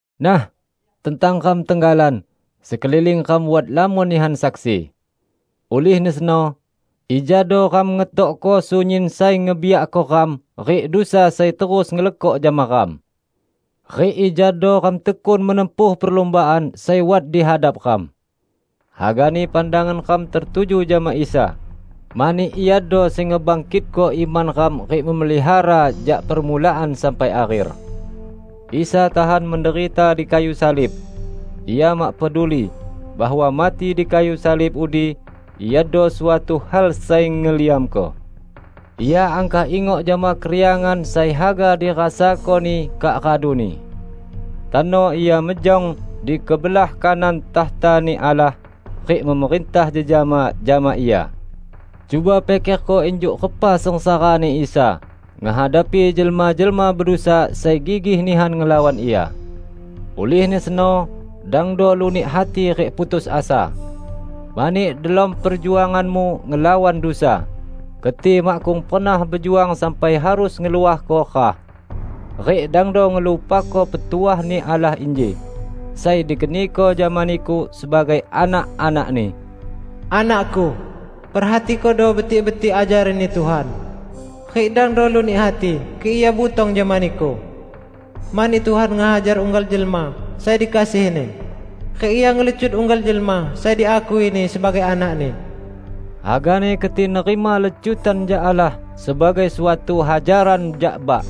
Nah, tentang ram tenggalan, sekeliling ram wat lamon nihan saksi! Ulihni seno, ijado ram ngetokko sunyin sai ngebiakko ram rik dusa sai terus ngelekok jama ram. Rik ijado ram tekun menempuh perlumbaan sai wat di hadap ram. Hagani pandangan ram tertuju jama Isa, mani Iado sai ngebangkitko iman ram rik melihara jak permulaan sampai akher. Isa tahan menderita di kayu salib! Ia mak peduli bahwa mati di kayu salib udi iado suatu hal sai ngeliamko. Ia angkah ingok jama keriangan sai haga dirasako-Ni kak raduni. Tano Ia mejong di kebelah kanan takhta-Ni Allah rik memerintah jejama jama Ia. Cuba pikerko injuk repa sengsara-Ni Isa ngehadapi jelma-jelma bedusa sai gigih nihan ngelawan Ia! Ulihni seno dangdo lunik hati rik putus asa. Mani delom perjuanganmu ngelawan dusa, keti makkung pernah bejuang sampai harus ngeluahko rah. Rik dangdo ngelupako petuah-Ni Allah inji, sai dikeniko jama niku sebagai anak-anak-Ni: "Anak-Ku, perhatikodo betik-betik ajaran-Ni Tuhan, rik dangdo lunik hati kik Ia butong jama niku. Mani Tuhan ngehajar unggal jelma sai dikasihi-Ni, rik Ia ngelecut unggal jelma sai diakui-Ni sebagai anak-Ni." Hagani keti nerima lecutan jak Allah sebagai suatu hajaran jak bak.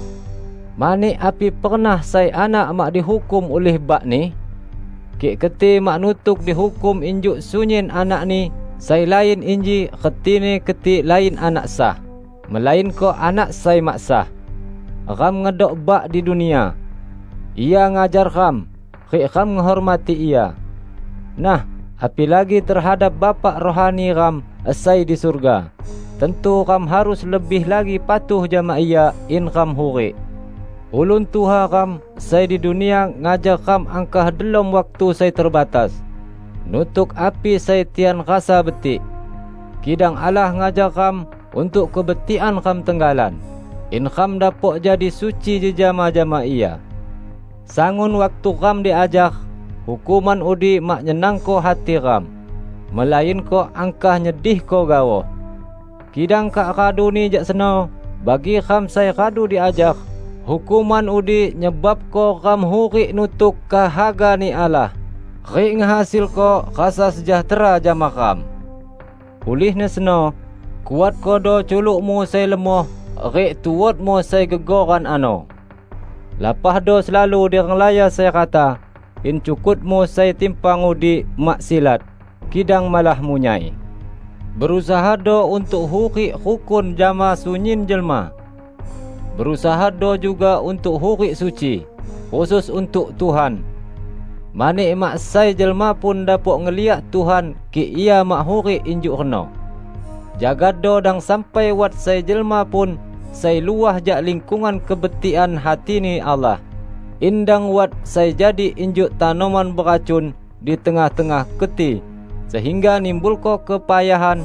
Mani api pernah sai anak mak dihukum ulih bakni? Kik keti mak nutuk dihukum injuk sunyin anakni sai lain inji retini keti lain anak sah, melainko anak sai mak sah. Ram ngedok bak di dunia. Ia ngajar ram, rik ram ngehormati ia. Nah, apilagi tehadap Bapa rohani ram sai di surga, tantu ram harus lebih lagi patuh jama Ia in ram hurik. Ulun tuha ram sai di dunia ngajar ram angkah delom waktu sai terbatas, nutuk api sai tian rasa betik. Kidang Allah ngajar ram untuk kebetikan ram tenggalan, in ram dapok jadi suci jejama jama Ia. Sangun waktu ram diajar, hukuman udi mak nyenangko hati ram, melainko angkah nyedihko gaoh. Kidang kak raduni jak seno, bagi ram sai radu diajar, hukuman udi nyebabko ram hurik nutuk kehaga-Ni Allah, rik ngehasilko rasa sejahtera jama ram. Ulihni seno, kuatkodo culukmu sai lemoh rik tuotmu sai gegoran ano! Lapahdo selalu di renglaya sai rata, in cukutmu sai timpang udi mak silat, kidang malah munyai. Berusahado untuk hurik rukun jama sunyin jelma. Berusahado juga untuk hurik suci, khusus untuk Tuhan. Mani mak sai jelma pun dapok ngeliak Tuhan kik ia mak hurik injuk reno. Jagado dang sampai wat sai jelma pun sai luah jak lingkungan kebetikan hati-Ni Allah, in dang wat sai jadi injuk tanoman beracun di tengah-tengah keti sehingga nimbulko kepayahan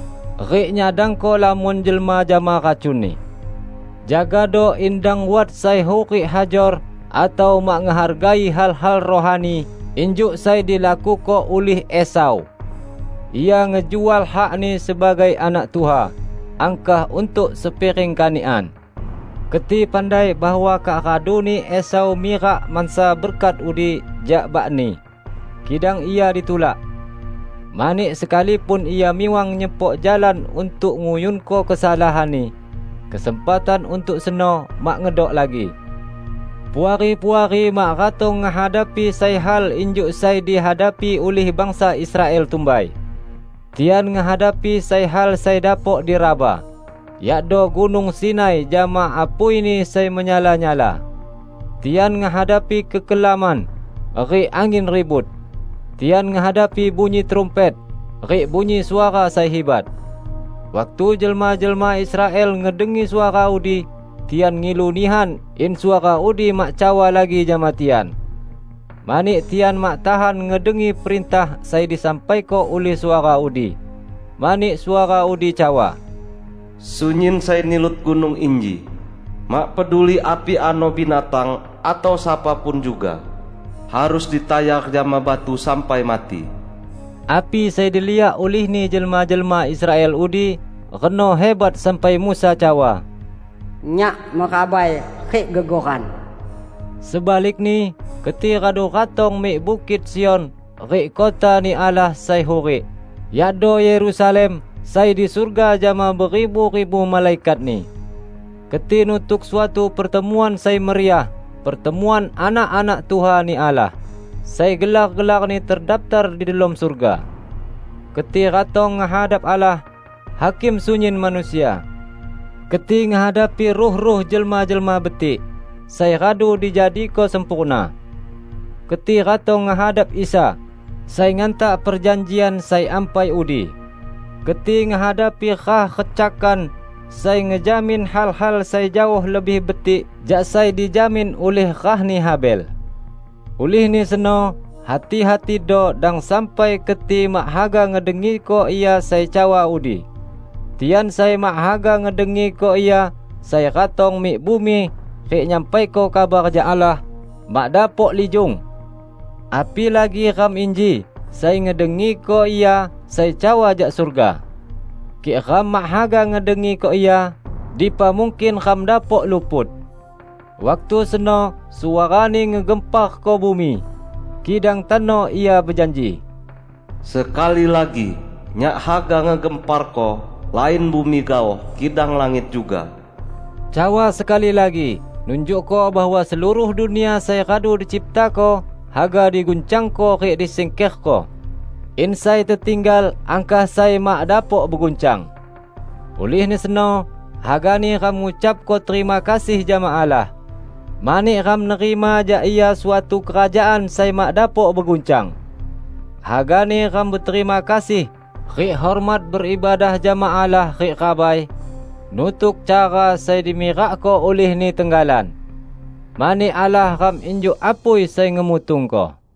rik nyadangko lamon jelma jama racuni. Jagado in dang wat sai hurik hajor atau mak ngehargai hal-hal rohani, injuk sai dilakuko ulih Esau. Ia ngejual hakni sebagai anak tuha, angkah untuk sepiring kanikan. Keti pandai bahwa kak raduni Esau mirak mansa berkat udi jak bakni, kidang ia ditulak. Mani sekalipun ia miwang nyepok jalan untuk nguyunko kesalahanni, kesempatan untuk seno mak ngedok lagi. Puari-puari mak ratong ngehadapi sai hal injuk sai dihadapi ulih bangsa Israel tumbai. Tian ngehadapi sai hal sai dapok diraba, yakdo Gunung Sinai jama apuini sai menyala-nyala; tian ngehadapi kekelaman, rik angin ribut; tian ngehadapi bunyi trumpet, rik bunyi suara sai hibat. Waktu jelma-jelma Israel ngedengi suara udi, tian ngilu nihan in suara udi mak cawa lagi jama tian. Mani tian mak tahan ngedengi perintah sai disampaiko ulih suara udi. Mani suara udi cawa, "Sunyin sai nilut gunung inji, mak peduli api ano binatang atau sapa pun juga, harus ditayar jama batu sampai mati." Api sai diliak ulihni jelma-jelma Israel udi reno hibat sampai Musa cawa, "Nyak merabai rik gegoran!" Sebalikni, keti radu ratong mik Bukit Sion rik kota-Ni Allah sai hurik, yakdo Yerusalem sai di surga jama beribu-ribu malaikatni. Keti nutuk suatu pertemuan sai meriah -- pertemuan anak-anak tuha-Ni Allah, sai gelar-gelarni terdaptar di delom surga. Keti ratong ngehadap Allah, Hakim sunyin manusia. Keti ngehadapi ruh-ruh jelma-jelma betik, sai radu dijadiko sempurna. Keti ratong ngehadap Isa, Sai Ngantak perjanjian sai ampai udi; keti ngehadapi rah recakan sai ngejamin hal-hal sai jaoh lebih betik jak sai dijamin ulih rahni Habel. Ulihni seno, hati-hatido dang sampai keti mak haga ngedengiko Ia sai cawa udi. Tian sai mak haga ngedengiko Ia sai ratong mik bumi rik nyampaiko kabar jak Allah, mak dapok lijung. Apilagi ram inji sai ngedengiko Ia sai cawa jak surga! Kik ram mak haga ngedengiko Ia, dipa mungkin ram dapok luput! Waktu seno suara-Ni ngegemparko bumi. Kidang tano Ia bejanji, "Sekali lagi, Nyak haga ngegemparko lain bumi gaoh kidang langit juga." Cawa "sekali lagi" nunjukko bahwa seluruh dunia sai radu diciptako haga diguncangko rik disingkerko, in sai tetinggal angkah sai mak dapok beguncang. Ulihni seno, hagani ram ngucapko terima kasih jama Allah, mani ram nerima jak Ia suatu kerajaan sai mak dapok beguncang. Hagani ram beterima kasih rik hormat beibadah jama Allah rik rabai, nutuk cara sai dimirakko ulih-Ni tenggalan. Mani Allah ram injuk apui sai ngemutungko.